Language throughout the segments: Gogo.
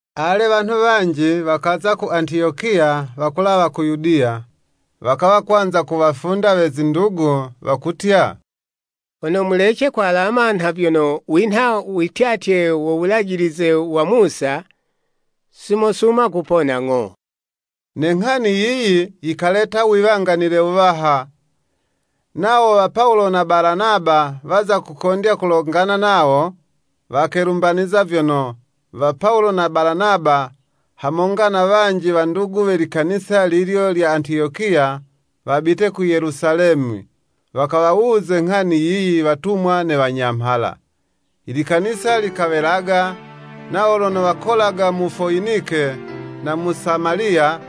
Ale, wanhu wanji wakaza ku Antiyokiya wakulawa ku Yudiya, wakawa kwanza kuwafunda we zindugu, wakutya, “Hono mulece kwalama nha vyono winha wityatye wo Wulajilize wa Musa, si mosuma kupona ng'o.” Ne nghani yiyi, yikaleta wiwanganile wuwaha, nawo wa Pawulo na Balanaba waza kukondya kulongana nawo, wakelumbaniza vyono, wa Pawulo na Balanaba, hamonga na wanji wandugu we likanisa lilyo lya Antiyokiya, wabite ku Yelusalemi wakawawuze nghani yiyi watumwa ne wanyamhala. Ilikanisa likawelaga, nawo lono wakolaga mu Foyinike na mu Samaliya,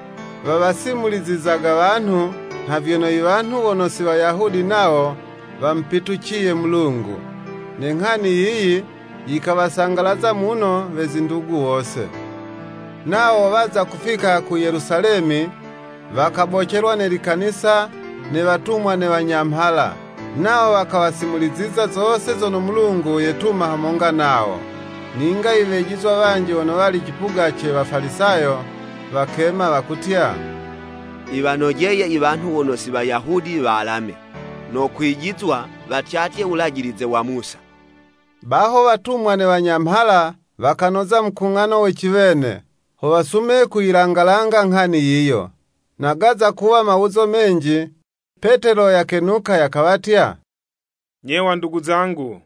wawasimulizizaga wanhu nha vyono i wanhu wono si Wayahudi nawo wamupituciye Mulungu. Ne nghani yiyi yikawasangalaza muno we zindugu wose. Nawo waza kufika ku Yelusalemi, wakabocelwa ne likanisa ne watumwa ne wanyamhala, nawo wakawasimuliziza zose zono Mulungu yaketuma hamonga nawo. Ninga iwejizwa wanji wono wali cipuga ce Wafalisayo, wakema, wakutya, “Yiwanojeye i wanhu wono si Wayahudi walame, no kwijizwa watyatye Wulajilize wa Musa.” Baho watumwa ne wanyamhala wakanoza mukung'ano wa ciwene, ho wasume kuyilanga langa nghani yiyo. Na gaza kuwa mawuzo menji, Petelo yakenuka yakawatya, “Nye wandugu zangu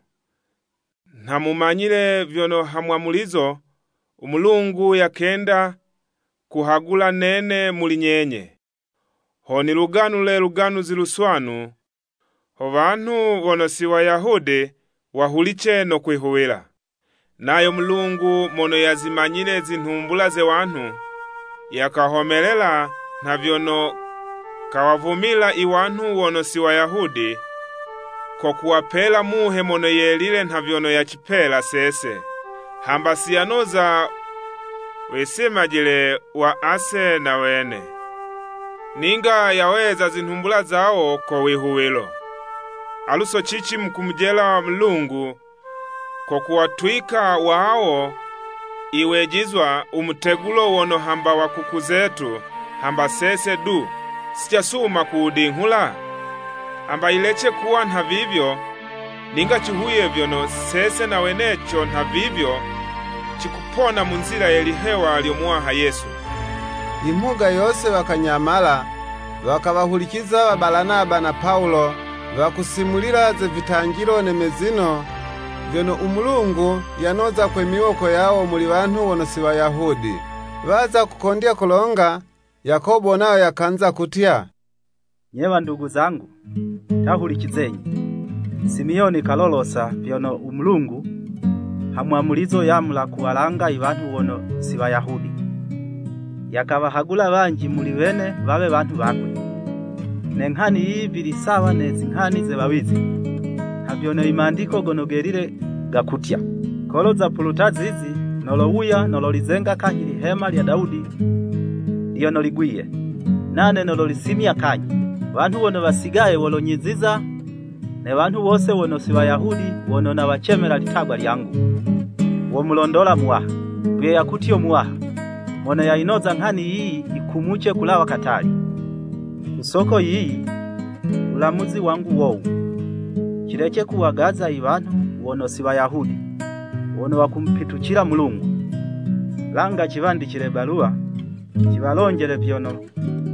nha mumanyile vyono ha mwamulizo, u Mulungu yakenda kuhagula nene muli nyenye, ho niluganule Luganuzi Luswanu, ho wanhu wono si Wayahudi, wahulice no kwihuwila. Nayo Mulungu mono yazimanyile zinhumbula ze wanhu, yakahomelelela nha vyono, kawavumila i wanhu wono si Wayahudi, ko kuwapela Muhe Mono Yelile nha vyono yacipela sese. Hamba si yanoza wisimajile wa ase na wene, ninga yaweza zinhumbula zawo ko wihuwilo. Alu so cici mukumujela Mulungu, ko kuwatwika wawo iwejizwa u mutegulo wono hamba wa kuku zetu hamba sese du, si casuma kuwudinghula? Hamba yilece kuwa nhavivyo, ninga cihuwiye vyono, sese na weneco nhavivyo, cikupona mu nzila ye lihewa lyo Muwaha Yesu.” Imhuga yose wakanyamala, wakawahuliciza wa Balanaba na Pawulo, wakusimulila ze vitanjilo ne mezino, vyono u Mulungu, yanoza kwe miwoko yawo muli wanhu wono si Wayahudi. Waza kukondya kulonga, Yakobo nayo yakanza kutya, “Nye wandugu zangu, ta hulicizenyi! Simiyoni kalolosa nha vyono u Mulungu, ha mwamulizo, yamula kuwalanga i wanhu wono si Wayahudi, yakawahagula wanji muli wene wawe wanhu wakwe. Ne nghani yiyi vili sawa ne zinghani ze wawizi, nha vyono Imandiko Gono Gelile gakutya, ‘Kolo zapuluta zizi, nolowuya, nololizenga kanyhi lihema lya Dawudi lyono ligwiye. Nane nololisimya kanyhi, Wanhu wono wasigaye, wolonyiziza, Ne wanhu wose wono si Wayahudi wono nawacemela litagwa lyangu, womulondola Muwaha. Vyo yakutyo Muwaha, mono yayinoza nghani yiyi yikumuce kulawa katali.’ “Ku soko yiyi, wulamuzi wangu wowu; cilece kuwagaza i wanhu wono si Wayahudi wono wakumupitucila Mulungu. Langa ciwandicile baluwa, ciwalonjele vyono,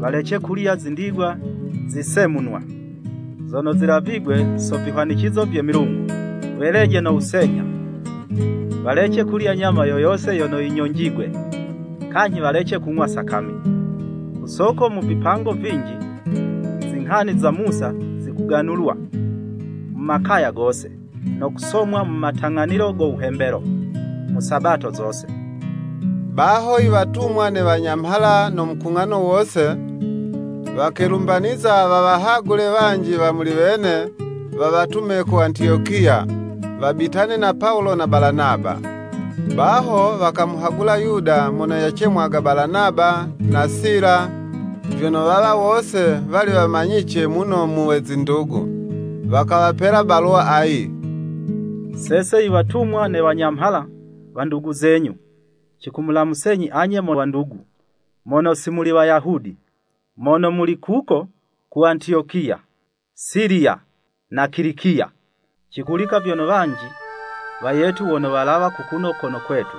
walece kulya zindigwa zisemunwa, zono zilavigwe so vihwanicizo vye milungu, weleje no wusenyha, walece kulya nyama yo yose yono yinyonjigwe, kanyhi walece kung'wa sakami. Ku soko mu vipango vinji, zinghani za Musa zikuganulwa mu makaya gose, no kusomwa mu matang'anilo go wuhembelo, mu Sabato zose.” Baho iwatumwa ne wanyamhala no mukung'ano wose, wakelumbaniza wawahagule wanji wa muli wene, wawatume ku Antiyokiya, wabitane na Pawulo na Balanaba. Baho wakamuhagula Yuda mono yacemwaga Balanaba, na Sila, vyono wawa wose wali wamanyice muno mu we zindugu. Wakawapela baluwa ayi, “Sese iwatumwa ne wanyamhala, wandugu zenyu, cikumulamusenyi anye mo wandugu, mono si muli Wayahudi, mono muli kuko ku Antiyokiya, Siliya, na Kilikiya. Cihulika vyono wanji wayetu wono walawa kukuno kono kwetu,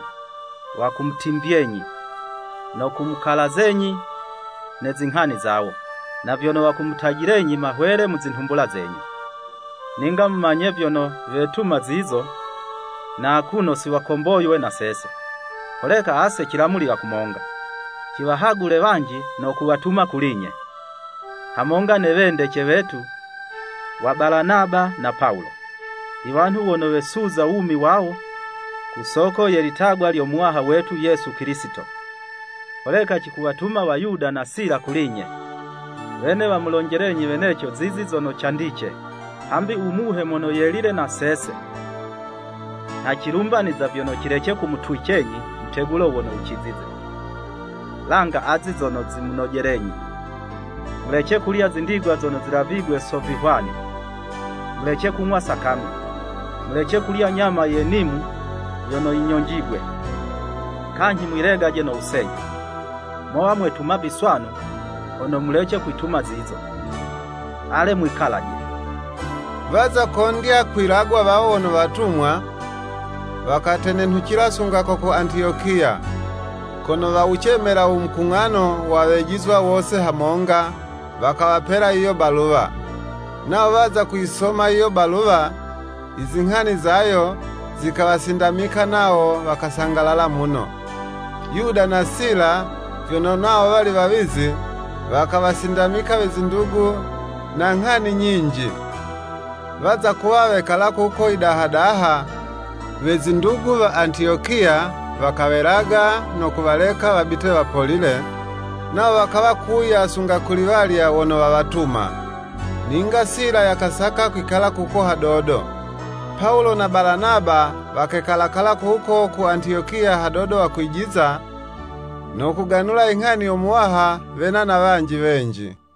wakumutimvyenyi no kumukalazenyi ne zinghani zawo, na vyono wakumutajilenyi mahwele mu zinhumbula zenyu. Ninga mumanye vyono, wetuma zizo, na akuno si wakomboywe na sese. Holeka ase cilamulila kumonga, ciwahagule wanji no kuwatuma kuli'nye, hamonga ne wendece wetu wa Balanaba na Pawulo. Iwanhu wono wesuza wumi wawo ku soko ye litagwa lyo Muwaha wetu Yesu Kilisito. Holeka cikuwatuma wa Yuda na Sila kuli'nye, wene womulonjelenyi weneco zizi zono candice. Hambi u Muhe Mono Yelile na sese, nha cilumbaniza vyono cilece kumutwicenyi mutegulo wono wucizize, langa azi zono zimunojelenyi. Mulece kulya zindigwa zono zilavigwe so vihwani, mulece kung'wa sakami, mulece kulya nyama ye nimu yono yinyonjigwe, kanyhi mwilegaje no wusenyha. Mowa mwetuma viswanu, hono mulece kwituma zizo. Ale mwikalaje!” Waza kondya kwilagwa, wawo wono watumwa, wakatenenhucila sunga ko ku Antiyokiya, kono wawucemela u mukung'ano wa Wejizwa wose hamonga, wakawapela yiyo baluwa. Nawo waza kuyisoma yiyo baluwa, izinghani zayo, zikawasindamika nawo wakasangalala muno. Yuda na Sila, vyono nawo wali wawizi, wakawasindamika we zindugu na nghani nyinji. Waza kuwa wekala kuko yidaha-daha, we zindugu wa Antiyokiya wakawelaga, no kuwaleka wabite wapolile, nawo wakawa kuwuya sunga kuli walya wono wawatuma. [ Ninga Sila yakasaka kwikala kuko hadodo.] Pawulo na Balanaba wakekala-kala kuko ku Antiyokiya hadodo wakwijiza, no kuganula inghani yo Muwaha wena na wanji wenji.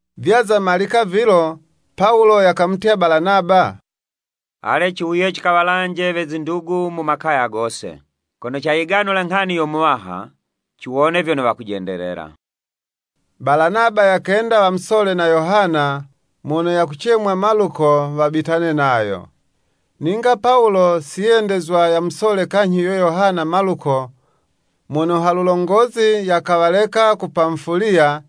Vyaza malika vilo, Pawulo yakamutya Balanaba, “Ale ciwuye cikawalanje we zindugu mu makaya gose, kono cayiganula nghani yo Muwaha, ciwone vyono wakujendelela.” Balanaba yakenda wamusole na Yohana mono yakucemwa Maluko wabitane nayo. Ninga Pawulo si yendezwa yamusole kanyhi yuyo Yohana (Maluko) mono halulongozi yakawaleka ku Pamufuliya,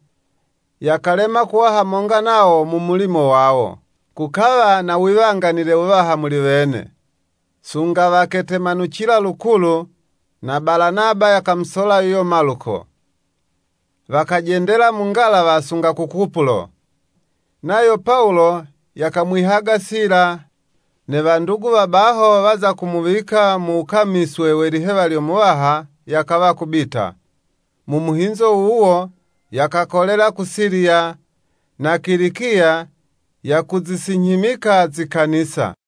yakalema kuwa hamonga nawo mu mulimo wawo. Kukawa na wiwanganile wuwaha muli wene, sunga waketemanucila lukulu, na Balanaba yakamusola yuyo Maluko, wakajendela mu ngalawa sunga ku Kupulo. Nayo Pawulo, yakamwihaga Sila, ne wandugu wa baho waza kumuwika mu wukamiswe we lihewa lyo Muwaha, yakawa kubita. Mu muhinzo wuwo, yakakolela ku Siliya na Kilikiya yakuzisinyhimika zikanisa.